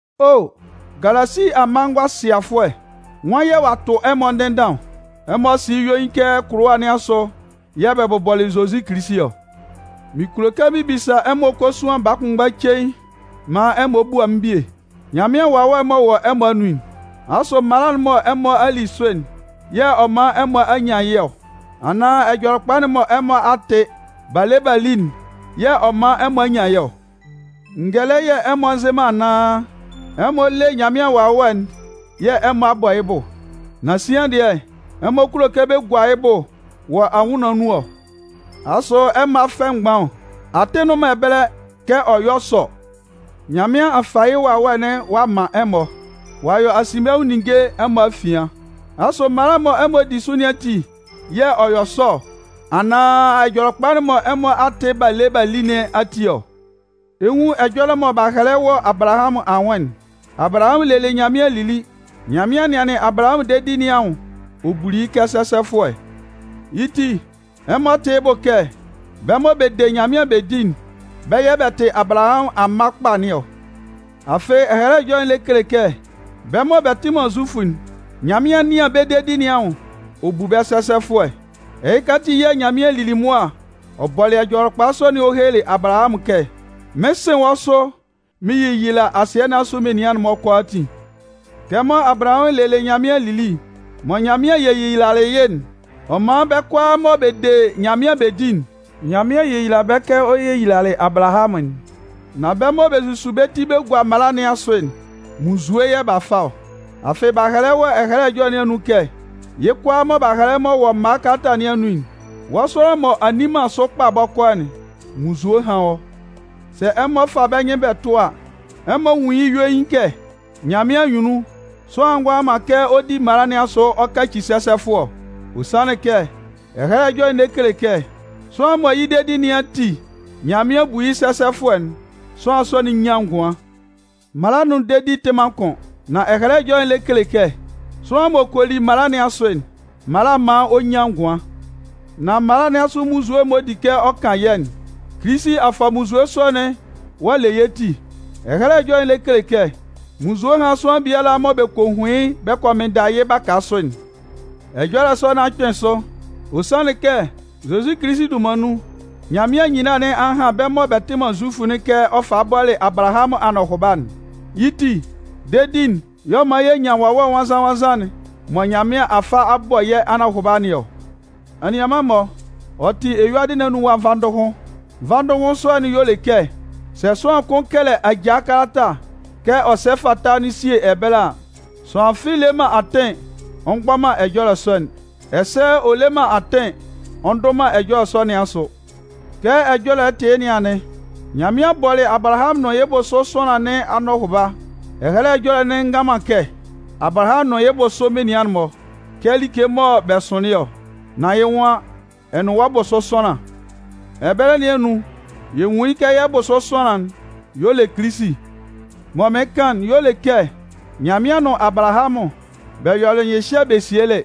O! Galasi amma ngʋasɩafʋɛ. Nwan yɛ̂ ɔ'a tʋ ɛmɔ ndɩnndan ɔ? Ɛmɔ sɩ yɩ́ yuein kɛ kʋlʋwa nɩn asʋ yɛ̂ bɛ bʋbɔlɩ Zozi Kilisi ɔ. Mɩn kulo kɛ mɩn bisa ɛmɔ kosuan baa kʋnmgba cein maan ɛmɔ bua mɩ́n bie. Nyanmɩan Wawɛ'n m'ɔ wɔ ɛmɔ anun'n, asʋ mala'n mɔ ɛmɔ a li sʋ'n yɛ̂ ɔ man ɛmɔ a nyan yɩ́ anaan Ɛjɔlɛkpa'n mɔ ɛmɔ a tɩ b'a le b'a li'n yɛ̂ ɔ man ɛmɔ a nyan yɩ́ ɔ? Ngɛlɛ yɛ̂ ɛmɔ nzɩ man anaan? Ɛmɔ le Nyanmɩan Wawɛ'n yɛ̂ ɛmɔ a bɔ yɩ́ bʋ. Sian dɩɛ, ɛmɔ kulo kɛ bɛ gua yɩ́ bʋ wɔ anwʋnnaan nun ɔ? Asʋ ɛmɔ a fɛ mgban ɔ? Atɩn nnʋn man ɛbɛlɛ kɛ ɔ yɔ́ sɔ. Nyanmɩan a fa yɩ́ Wawɛ'n ɔ'a man ɛmɔ. Ɔ yɔ asinbɛnwʋn ninnge ɛmɔ afian. Asʋ mala'n mɔ ɛmɔ di sʋ nɩn ati yɛ̂ ɔ yɔ sɔ anaan Ɛjɔlɛkpa'n mɔ ɛmɔ a tɩ b'a le b'a li nɩn ati ɔ? Ɛ 'nwun ɛjɔlɛ mɔ b'a hɛlɛ wɔ Abalahamʋn anwʋn'n: Abalahamʋn lelɩ Nyanmɩan lili. Nyanmɩan nɩanlɩn Abalahamʋn dedi nɩn anwʋn ɔ buli yɩ́ kɛ sɛsɛfʋɛ. Yɩ́ ti, ɛmɔ tɩ́ yɩ́ bʋ kɛ bɛ́ mɔ bɛ de Nyanmɩan bɛ di'n, bɛ́ yɛ̂ bɛ tɩ Abalahamʋn amma kpa nɩn ɔ. Afɩ Ɛhɛlɛ Ɛjɔlɛ'n lɛ kele kɛ, bɛ́ mɔ bɛ tɩ man Zufʋ'n, Nyanmɩan 'nɩan bɛ́ dedi nɩn anwʋn ɔ bu bɛ́ sɛsɛfʋɛ. Ɛhɩka ati yɛ̂ Nyanmɩan lili mʋa ɔ bɔlɩ Ɛjɔlɛkpa sɔ'n ɔ helelɩ Abalahamʋn kɛ: Mɩn 'sɩn wɔ́ sʋ mɩn yeyila asɩɛ nɩn asʋ menian'n-mɔ kʋalaatin. Kɛmɔ Abalahamʋn lelɩ Nyanmɩan lili, mɔ Nyanmɩan 'yeyilalɩ yɩ́'n, ɔ man bɛ́ kʋalaa mɔ bɛ de Nyanmɩan bɛ di'n, Nyanmɩan yeyila bɛ́ kɛ ɔ yeyilalɩ Abalahamʋn'n. Nan bɛ́ mɔ bɛ susu bɛ́ ti bɛ gua mala nɩn asʋ'n, munnzue yɛ̂ b'a fa ɔ. Afɩ b'a hɛlɛ wɔ Ɛhɛlɛ Ɛjɔlɛ nɩn anun kɛ: Yɩ́ kʋalaa mɔ b'a hɛlɛ m'ɔ wɔ mala kalata nɩn anun'n, wɔ́ sʋanlan mɔ a nni man sʋ kpa bɔkɔɔ'n, munnzue hán wɔ́. Sɛ ɛmɔ fa bɛ́ nyɩn bɛ tʋ a, ɛmɔ nwun yɩ́ yuein kɛ, Nyanmɩan anyunnun, sʋanlan ngʋala man kɛ ɔ di mala nɩn asʋ ɔ kaci sɛsɛfʋɛ ɔ. Ɔ sanlɩn kɛ Ɛhɛlɛ Ɛjɔlɛ'n lɛ kele kɛ: Sʋanlan mɔ yɩ́ dedi nɩn ati Nyanmɩan bu yɩ́ sɛsɛfʋɛ'n, sʋanlan sɔ'n 'nyan ngʋan. Mala'n nʋn dedi'n tɩ man kʋn. Nan Ɛhɛlɛ Ɛjɔlɛ'n lɛ kele kɛ: Sʋanlan m'ɔ kɔ li mala nɩn asʋ'n, mala'n maan ɔ 'nyan ngʋan. Nan mala nɩn asʋ munnzue'n m'ɔ di kɛ ɔ kan yɛ́'n, Kilisi a fa munnzue sɔ'n ɔ'a le yɛ́ ti. Ɛhɛlɛ Ɛjɔlɛ lɛ kele kɛ: Munnzue hán sʋanlan biala mɔ bɛ kɔ hun yɩ́ bɛ kɔ mɩnnda yɩ́ baka sʋ'n. Ɛjɔlɛ sɔ nɩn a kpɩn sʋ. Ɔ sanlɩn kɛ, Zozi Kilisi dunman nun, Nyanmɩan nyila nɩn a han bɛ́ mɔ bɛ tɩ man Zufʋ'n kɛ ɔ falɩ bɔlɩ Abalahamʋn anɔhʋba'n. Yɩ́ ti, dedi'n y'ɔ man yɛ nyan Wawɛ Nwannzan-nwannzan'n mɔ Nyanmɩan a fa a bɔ yɛ́ anɔhʋba nɩn ɔ. Anianman-mɔ, ɔ tɩ eyuadɩ nɩn anun ɛwa nvandʋhʋn. Nvandʋhʋn sɔ'n y'ɔ le kɛ, sɛ sʋanlan kʋn kɛlɛ ajâ kalata kɛ ɔ sɛ fata'n sie ɛbɛlɛ a, sʋanlan fɩ́ɩ́ le man atɩn ɔ mgbɔ man ɛjɔlɛ sɔ'n, ɛsɛ ɔ le man atɩn ɔ ndʋ man ɛjɔlɛ sɔ nɩn asʋ. Kɛ ɛjɔlɛ'n tɩ yɩ́ nɩn anɩn. Nyanmɩan bɔlɩ Abalahamʋn nʋn yɩ́ bʋsʋ sʋanlan nɩn anɔhʋba. Ɛhɛlɛ Ɛjɔlɛ'n ngan man kɛ: “Abalahamʋn nʋn yɩ́ bʋsʋ menian'n-mɔ” kɛ like mɔ bɛ sʋnlɩn ɔ. Nan yɩ́ nwan: “Ɛ nʋn wɔ́ bʋsʋ sʋanlan.” Ɛbɛlɛ nɩn anun, yɛ nwun yɩ́ kɛ, yɩ́ bʋsʋ sʋanlan sɔ'n y'ɔ le Kilisi. Mɔ mɩɩn kan'n y'ɔ le kɛ Nyanmɩan nʋn Abalahamʋn bɛ yɔlɩ nyɩhyɛ bɛ sielɩ.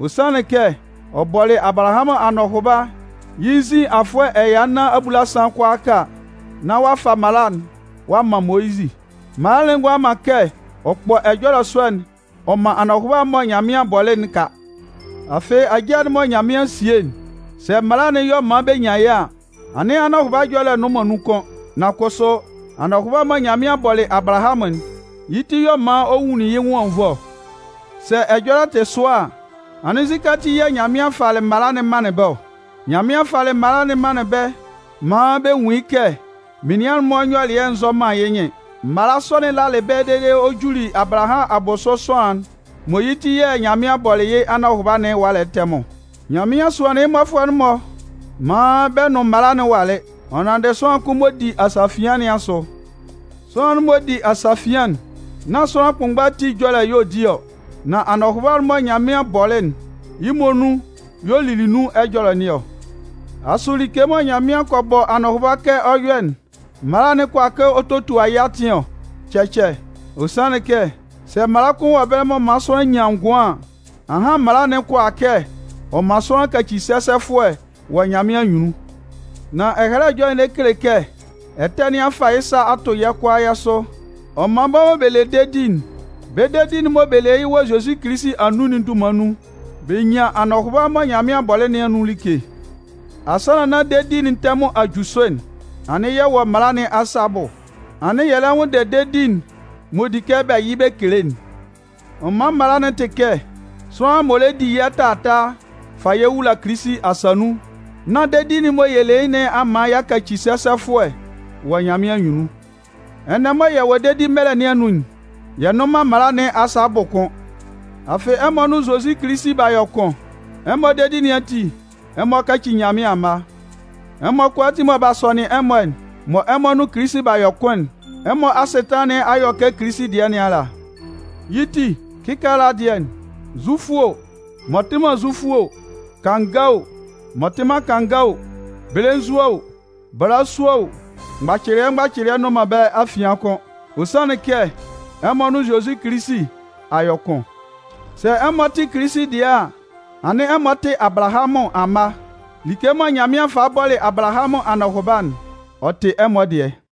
Ɔ sanlɩn kɛ ɔ bɔlɩ Abalahamʋn anɔhʋba yɩ́ nzin afʋɛ ɛya nnan abulasan kʋalaaka nán ɔ'a fa mala'n ɔ'a man Moyizɩ. Mala'n ngʋala man kɛ ɔ kpɔ ɛjɔlɛ sɔ'n ɔ man anɔhʋba'n mɔ Nyanmɩan bɔlɩ'n ka. Afɩ ajâ'n mɔ Nyanmɩan sie'n, sɛ mala'n y'ɔ man bɛ nyan yɩ́ a, anɩn anɔhʋba ɛjɔlɛ nnʋn man nun kʋ́n. Nan kʋsʋ, anɔhʋba'n mɔ Nyanmɩan bɔlɩ Abalahamʋn'n, yɩ́ ti y'ɔ man ɔ nwunlin yɩ́ nwʋn anwunnvoe ɔ. Sɛ ɛjɔlɛ'n tɩ sʋa a, anɩn nzukɛ ati yɛ̂ Nyanmɩan falɩ mala'n manlɩn bɛ́ ɔ? Nyanmɩan falɩ mala'n manlɩn bɛ́ maan bɛ nwun yɩ́ kɛ menian'n-mɔ nyɔlɩɛ'n nzɔ man yɩ́ nyɩn. Mala sɔ'n lalɩ ɛbɛlɛ dede ɔ juli Abalahamʋn abʋsʋ sʋanlan'n, mɔ yɩ́ ti yɛ̂ Nyanmɩan bɔlɩ yɩ́ anɔhʋba nɩn ɛwalɛ tɛmʋn. Nyanmɩan sʋanlɩn yɩ́ mmɔfʋɛ'n-mɔ maan bɛ nʋn mala'n walɩ, ɔ nanndɩ sʋanlan kʋn m'ɔ di asafian nɩn asʋ. Sʋanlan'n m'ɔ di asafian'n, nán sʋanlan kʋnmgba ati ɛjɔlɛ y'ɔ di ɔ, nan anɔhʋba'n mɔ Nyanmɩan bɔlɩ'n, yɩ́ muonun y'ɔ lili nun ɛjɔlɛ nɩn ɔ. Asʋ, like mɔ Nyanmɩan kɔ bɔ anɔhʋba kɛ ɔ 'yɔ'n, mala'n kʋala kɛ ɔ totua yɩ́ atɩn ɔ? Cɛcɛ! Ɔ sanlɩn kɛ, sɛ mala kʋn wɔ ɛbɛlɛ m'ɔ man sʋanlan nyan ngʋan an, ahan mala'n kʋala kɛ ɔ man sʋanlan kaci sɛsɛfʋɛ wɔ Nyanmɩan anyunnun. Nan Ɛhɛlɛ Ɛjɔlɛ'n lɛ kele kɛ ɛtɛ nɩn a fa yɩ́ sa a tʋ yɛ́ kʋalaa yɛ́ sʋ. Ɔ man bɛ́ mɔ bɛ le dedi'n, bɛ́ dedi'n mɔ bɛ le yɩ́ wɔ Zozi Kilisi anun'n dunman nun, bɛ nyan anɔhʋba'n mɔ Nyanmɩan bɔlɩ nɩn anun like. Asannan nán dedi'n tɛmʋn a ju sʋ'n, anɩn yɛ wɔ mala nɩn asa abʋ. Anɩn yɛ lɛ nwʋnndɛ dedi'n m'ɔ di kɛ bɛ yɩ bɛ kele'n Ɔ man mala'n tɩ kɛ sʋanlan m'ɔ lɛ di yɛ́ taataa fa yɛ́ wula Kilisi asa nun, nán dedi'n mɔ yɛ le yɩ́ nɩn a man y'a kaci sɛsɛfʋɛ wɔ Nyanmɩan anyunnun. Ɛnɛ mɔ yɛ wɔ dedi mɛlɛ nɩn anun'n, yɛ nnʋn man mala nɩn asa abʋ kʋ́n. Afɩ, ɛmɔ nʋn Zozi Kilisi b'a yɔ kʋn, ɛmɔ dedi nɩn ati, ɛmɔ a kaci Nyanmɩan amma. Ɛmɔ kʋalaatin mɔ b'a sɔnɩn ɛmɔ, mɔ ɛmɔ nʋn Kilisi b'a yɔ kʋn'n, ɛmɔ asɩtanlan nɩn a yɔ kɛ Kilisi dɩɛ nɩn ala. Yɩ́ ti, kɩkaala dɩɛ, Zufʋ o, m'ɔ tɩ man Zufʋ o, kanga o, m'ɔ tɩ man kanga o, belenzua o, balasua o, mgbacɩ mgbacɩɛ nnʋn man bɛ́ afian kʋ́n. Ɔ sanlɩn kɛ ɛmɔ nʋn Zozi Kilisi a yɔ kʋn. Sɛ ɛmɔ tɩ Kilisi dɩɛ a, anɩn ɛmɔ tɩ Abalahamʋn amma. Like mɔ Nyanmɩan falɩ bɔlɩ Abalahamʋn anɔhʋba'n, ɔ tɩ ɛmɔ dɩɛ.